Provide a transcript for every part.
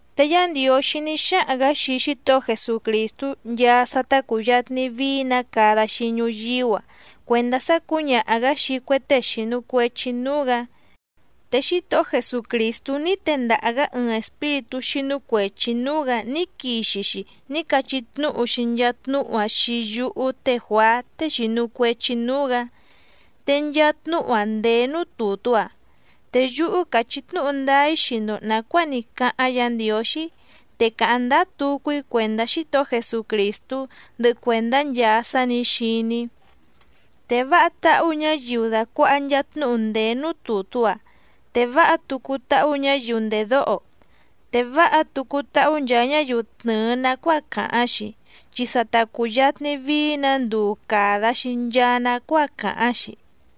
Te Yá Ndiǒxí ní xáhaⁿ‑gǎ xii Xítohó Jesucrìstú nchaa sá tá cùyatni vií‑nǎ cada‑xi ñuyíú‑a cuèndá sá cǔñaha‑gǎ xii cue tée xìnu cuechi núú‑gǎ, te Xítohó Jesucrìstú ní tendaha‑gǎ ɨɨⁿ espíritú xínú cuèchi núú‑gǎ ní quixi‑xi ní cachí tnúhu‑xi nchaa tnúhu‑áⁿ xii yúhú té Juàá tée xìnu cuechi núú‑gǎ, te nchaa tnúhu‑áⁿ ndèé núú tùtú‑a. Te yúhú càchí tnúhu ndáá‑í xii‑ndo nàcuáa ní cáháⁿ Yǎ Ndiǒxí, te càháⁿ ndáá tucu‑í cuèndá Xítohó Jesucrìstú, ndɨhɨ cuèndá nchaa sá nǐ xiní‑í. Te váha táhú ñǎyiu dàcuaha nchaa tnúhu ndèé núú tùtú‑a, te váha tucu táhú ñǎyiu ndèdóho, te váha tucu táhú nchaa ñáyiu tnɨ̀ɨ nacuáa càháⁿ‑xi, chi sa ta cùyatni vií‑nǎ nduu càda‑xi nchaa nacuáa càháⁿ‑xi.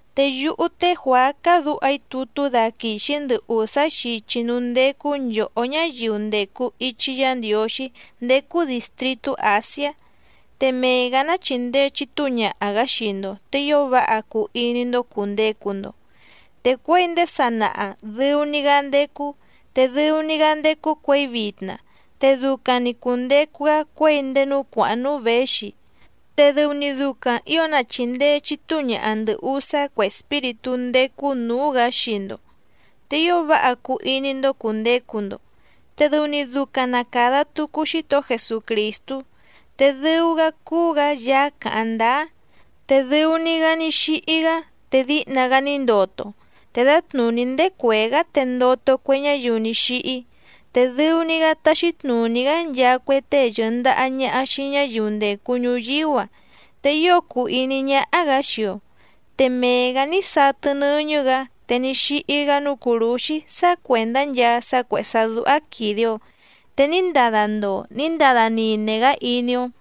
Te yúhú té Juàá cádǔha‑í tutú daquìxi‑í ndɨ ùsá xichi núú ndécú nchòhó ñáyiu ndècu ichi Yá Ndiǒxí ndécú dìstritú Àsiá. Te mee‑gǎ ná chìndee chitúu ñaha‑gǎ xii‑ndo, te ío váha cuu iní‑ndó cùndecu‑ndo. Te cuěi ndéé sanaha dɨu‑ni‑gá ndécú, te dɨu‑ni‑gá ndécú cuěi vitna, te ducaⁿ‑ni cùndecu‑gá cuěi ndéé núú cuàháⁿ núú věxi, te dɨu‑ni ducaⁿ ǐo na chìndee chitúu ñaha ndɨ̀ usá cue espíritú ndécú nǔú‑gǎ xii‑ndo, te ío váha cuu iní‑ndó cùndecu‑ndo. Te dɨu‑ni ducaⁿ na càda tucu Xítohó Jesucrìstú, te dɨu‑gá cúú‑gǎ Yaá càháⁿ ndáá, te dɨu‑ni‑gá ní xíhí‑gá te díhna‑gá ní ndoto, te dǎtnùní ndéé cuèé‑gá te ndoto cue ñáyiu ní xíhí, te dɨu‑ni‑gá táxí tnùní‑gá nchaa cue tée yɨ̀ndaha ñaha xii ñáyiu ndècu ñuyíú‑a. Te ío cùu iní ñáhá‑gǎ xii‑o, te mee‑gǎ ní satɨ nɨ́ñɨ́‑gǎ te ní xíhí‑gá núú cùrúxí sá cuèndá nchaa sá cuèhé sá dúhá quìde‑o, te ní ndada ndoo ní ndada nine‑gá iní‑ó,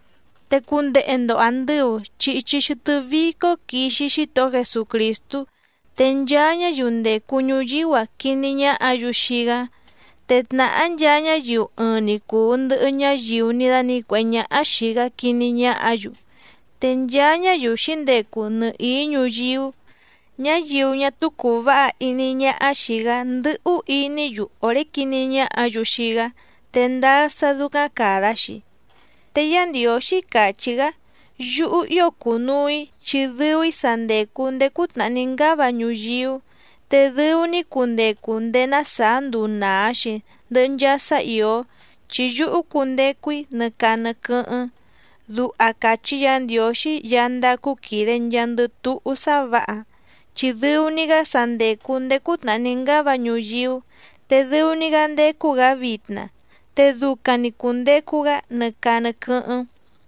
¡Te cundehe‑ndo àndɨu! Chi ichi xɨtɨ́ vícó quixi Xítohó Jesucrìstú, te nchaa ñáyiu ndècu ñuyíú‑a quiní ñáhǎ‑yu xii‑gá, te tnàhá nchaa ñáyiu ɨɨⁿ‑ni cùu ndɨhɨ ñáyiu ní dánǐcuèhé ñáhá xìi‑gá quiní ñáhǎ‑yu, te nchaa ñáyiu xǐndecu nɨhìí ñuyíú, ñáyiu ñá túú cùu váha iní ñáhá xìi‑gá ndɨ́hú iní‑yu òré quiní ñáhǎ‑yu xii‑gá, te ndáá sá dúcáⁿ càda‑xi. Te Yá Ndiǒxí càchí‑gá: “Yúhú ío cùnuu‑í chi dɨu‑í sa ndècu ndéé cútnàhá ní ngáva ñuyíú, te dɨu‑ni‑í cundecu ndéé ná sàá nduu nàa‑xi ndɨhɨ nchaa sá ìó, chi yúhú cundecu‑í nɨ caa nɨ quɨ́hɨ́ⁿ”, duha càchí Yǎ Ndiǒxí Yaá ndácú quìde nchaandɨ túhú sá vǎha. Chi dɨu‑ni‑gá sa ndècu ndéé cútnàhá ní ngáva ñuyíú, te dɨu‑ni‑gá ndécú‑gǎ vitna, te ducaⁿ‑ni cùndecu‑gá nɨ caa nɨ quɨ́hɨ́ⁿ.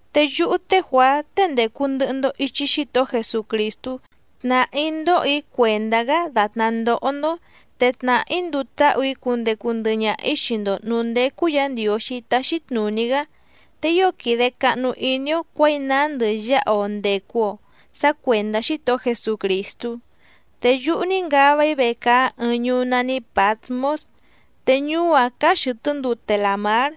Te yúhú té Juàá tée ndècu ndɨhɨ‑ndo ichi Xítohó Jesucrìstú, tnàhá‑í ndóhò‑í cuèndá‑gá dàtná ndóhó‑ndó, te tnàhá‑í nduu táhù‑í cundecu ndɨhɨ ñaha‑ǐ xii‑ndo nǔú ndécú Yǎ Ndiǒxí táxí tnùní‑gá. Te ío quìde cahnu iní‑ó cuěi nándɨ yáha‑o ndècu‑o sá cuèndá Xítohó Jesucrìstú. Te yúhú ní ngava‑í vecaá ɨɨⁿ ñuú nání Pǎtmós, te ñuú‑áⁿ cáá xɨ̀tɨ́ ndute làmár.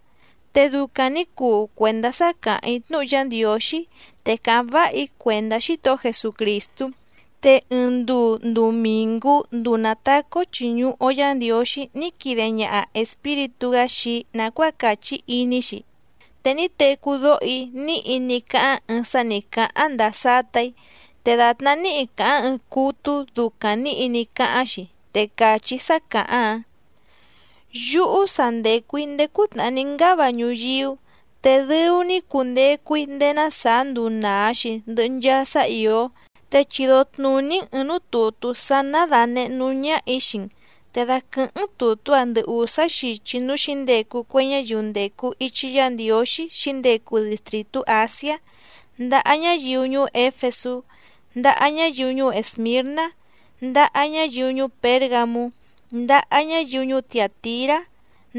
Te ducaⁿ nǐ cuu cuèndá sá càháⁿ‑í tnúhu Yá Ndiǒxí, te càháⁿ váha‑í cuèndá Xítohó Jesucrìstú. Te ɨɨⁿ nduu ndumìngú nduu nàtacá‑ó chìñuhu‑o Yá Ndiǒxí ní quide ñaha Espíritú‑gá xii‑í nàcuáa càchí iní‑xi, te ní tecú dóho‑í níhi ní cáháⁿ ɨɨⁿ sá nǐ cáháⁿ ndàa sátà‑í te dàtná níhi càháⁿ ɨɨⁿ cútú ducaⁿ nǐhi ní cáháⁿ‑xi. Te càchí sá càháⁿ‑áⁿ: —Yúhú sa ndècu‑í ndéé cútnàhá ní ngáva ñuyíú, te dɨu‑ni‑í cundecu‑í ndéé ná sàá nduu nàa‑xi ndɨhɨ nchaa sá ìó, te chido tnùní‑n ɨ̀ɨⁿ núú tùtú sá ná dànehé núú ñáhà‑í xii‑n, te daquɨ̀hɨ́ⁿ‑n tùtú‑áⁿ ndɨ ùsá xichi núú xǐndecu cue ñáyiu ndècu ichi Yá Ndiǒxí xǐndecu distrìtú Àsiá, ndaha ñáyiu ñuú Éfesú, ndaha ñáyiu ñuú Èsmirná, ndaha ñáyiu ñuú Pěrgamú, ndaha ñáyiu ñuú Tiàtirá,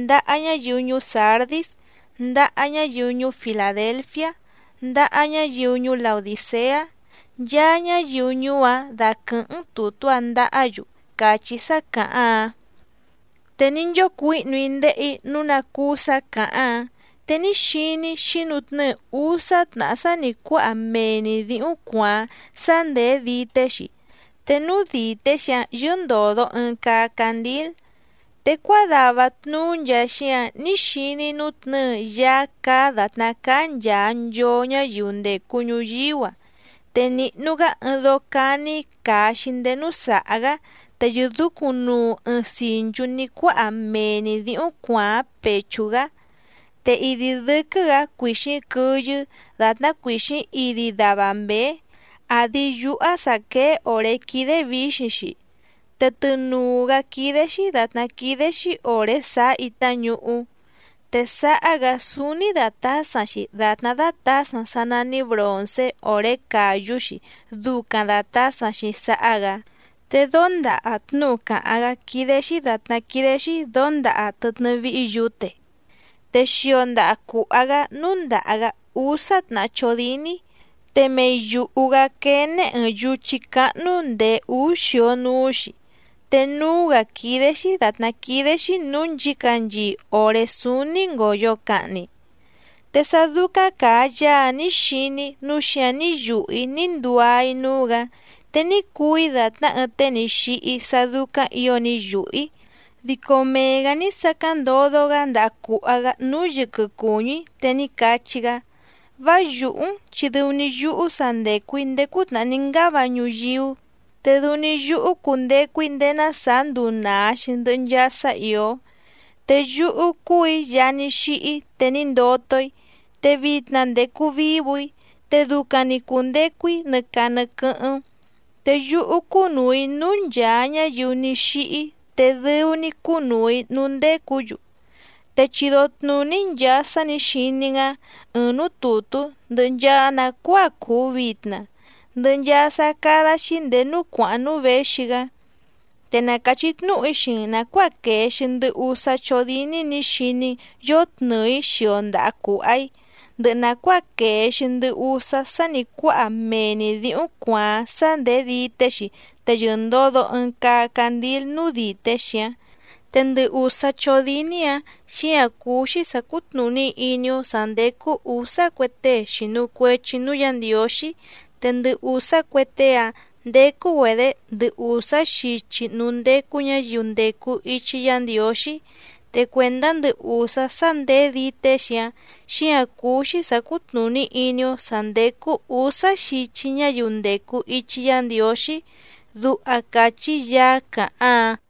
ndaha ñáyiu ñuú Sǎrdís, ndaha ñáyiu ñuú Filàdelfiá, ndaha ñáyiu ñuú Laodìceá, nchaa ñáyiu ñuú‑áⁿ daquɨ̀hɨ́ⁿ‑n tùtú‑áⁿ ndahá‑yu —càchí sá càháⁿ‑áⁿ. Te ní nchócuǐhnu‑í ndéhè‑í nǔu ná cúú sǎ càháⁿ‑áⁿ, te ní xiní‑í xǐnutnɨ́ɨ úsá tnàhá sá nǐ cuáha mee‑ni dǐhúⁿ cuàáⁿ sá ndèé dité‑xi, te núú dìté‑xi‑áⁿ yɨ́ndòdo ɨɨⁿ caa candíl. Te cuádava tnuú nchaa xíǎⁿ ní xiní‑í nútnɨ̌ɨ Yaá cáá dàtná cáá nchàa nchoo ñáyiu ndècu ñuyíú‑a, te nìhnu‑gá ɨɨⁿ dóó cání càa‑xi ndéé núú sàhá‑gá, te yɨ̀dúcúⁿnuu ɨɨⁿ sìnchú ní cuáha mee‑ni dǐhúⁿ cuàáⁿ pèchú‑gá. Te idi dɨ́quɨ́‑gǎ cuìxíⁿ quɨyɨ́ dàtná cuìxíⁿ idi dava mběé, àdi yúhá sǎ quéé òré quídé vǐxiⁿ‑xi, te tɨnùu‑gá quídé‑xí dàtná quídé‑xí òré sàá itá ñuhú. Te sáhá‑gǎ súúní dàtásaⁿ‑xi dàtná dátǎsaⁿ sá nání bròncé òré càyú‑xi ducaⁿ dàtásaⁿ‑xi sáhá‑gǎ, te dóndaha tnúhu càháⁿ‑gá quídé‑xí dàtná quídé‑xí dǒndaha tɨtnɨ́ víhí yǔte. Te xio ndaha cùha‑gá núndàha‑gá úsá tnàhá chódíní, te mei yùhu‑gá quéné ɨ̀ɨⁿ yuchí cáhnú ndèé úú xio núú‑xi, te núú‑gǎ quídé‑xí dàtná quídé‑xí nǔú nchǐcanchii òré súúní ngòyo cahni. Te sá dúcáⁿ càa Yaá‑áⁿ nǐ xiní‑í nǔu xíǎⁿ ní yùhú‑í ní nduá‑í núú‑gǎ, te ní cuu‑í dàtná ɨɨⁿ tée ní xíhí sá dúcáⁿ ǐo ní yùhú‑í, dico mee‑gǎ ní sacáⁿ ndodo‑gá ndaha cùha‑gá núú yɨquɨ cùñú‑í, te ní cachí‑gá: —Vá yùhú‑n, chi dɨu‑ni yúhú sa ndècu‑í ndéé cútnàhá ní ngáva ñuyíú, te dɨu‑ni yúhú cundecu‑í ndéé ná sàá nduu nàa‑xi ndɨhɨ nchaa sá ìó. Te yúhú cúù‑í Yaá ní xíhí te ní ndoto‑í, te vitna ndècu vívù‑í, te ducaⁿ‑ni cùndecu‑í nɨ caa nɨ quɨ́hɨ́ⁿ. Te yúhú cúnùu‑í núú nchàa ñáyiu ní xíhí te dɨu‑ni‑í cúnùu‑í núú ndécǔ‑yu. Te chido tnùní‑n nchàa sá nǐ xiní‑n‑áⁿ ɨ̀ɨⁿ núú tùtú, ndɨhɨ nchaa nàcuáa cùu vitna, ndɨhɨ nchaa sá cádá‑xí ndèé núú cuàháⁿ núú věxi‑gá. Te na càchí tnúhu‑í xii‑n nàcuáa quèe‑xi ndɨ usá chódíní nǐ xiní‑n yòtnɨɨ‑í xio ndaha cùha‑í, ndɨhɨ nàcuáa quèe‑xi ndɨ usá sá nǐ cuáha mee‑ni dǐhúⁿ cuàáⁿ, sá ndèé dité‑xi te yɨ̀ndodo ɨɨⁿ caa candíl núú dìté‑xi‑áⁿ. Te ndɨ ùsá chódíní‑ǎⁿ, xíǎⁿ cúú‑xí sǎ cútnùní iní‑ó sǎ ndécú ǔsá cue tée xìnu cuechi núú Yǎ Ndiǒxí, te ndɨ ùsá cue tée‑áⁿ ndécú‑güedě ndɨ ùsá xichi núú ndécú ñǎyiu ndècu ichi Yá Ndiǒxí. Te cuèndá ndɨ ùsá sá ndèé dité‑xi‑áⁿ, xíǎⁿ cúú‑xí sǎ cútnùní iní‑ó sǎ ndécú ǔsá xichi ñáyiu ndècu ichi Yá Ndiǒxí —duha càchí Yaá càháⁿ‑áⁿ.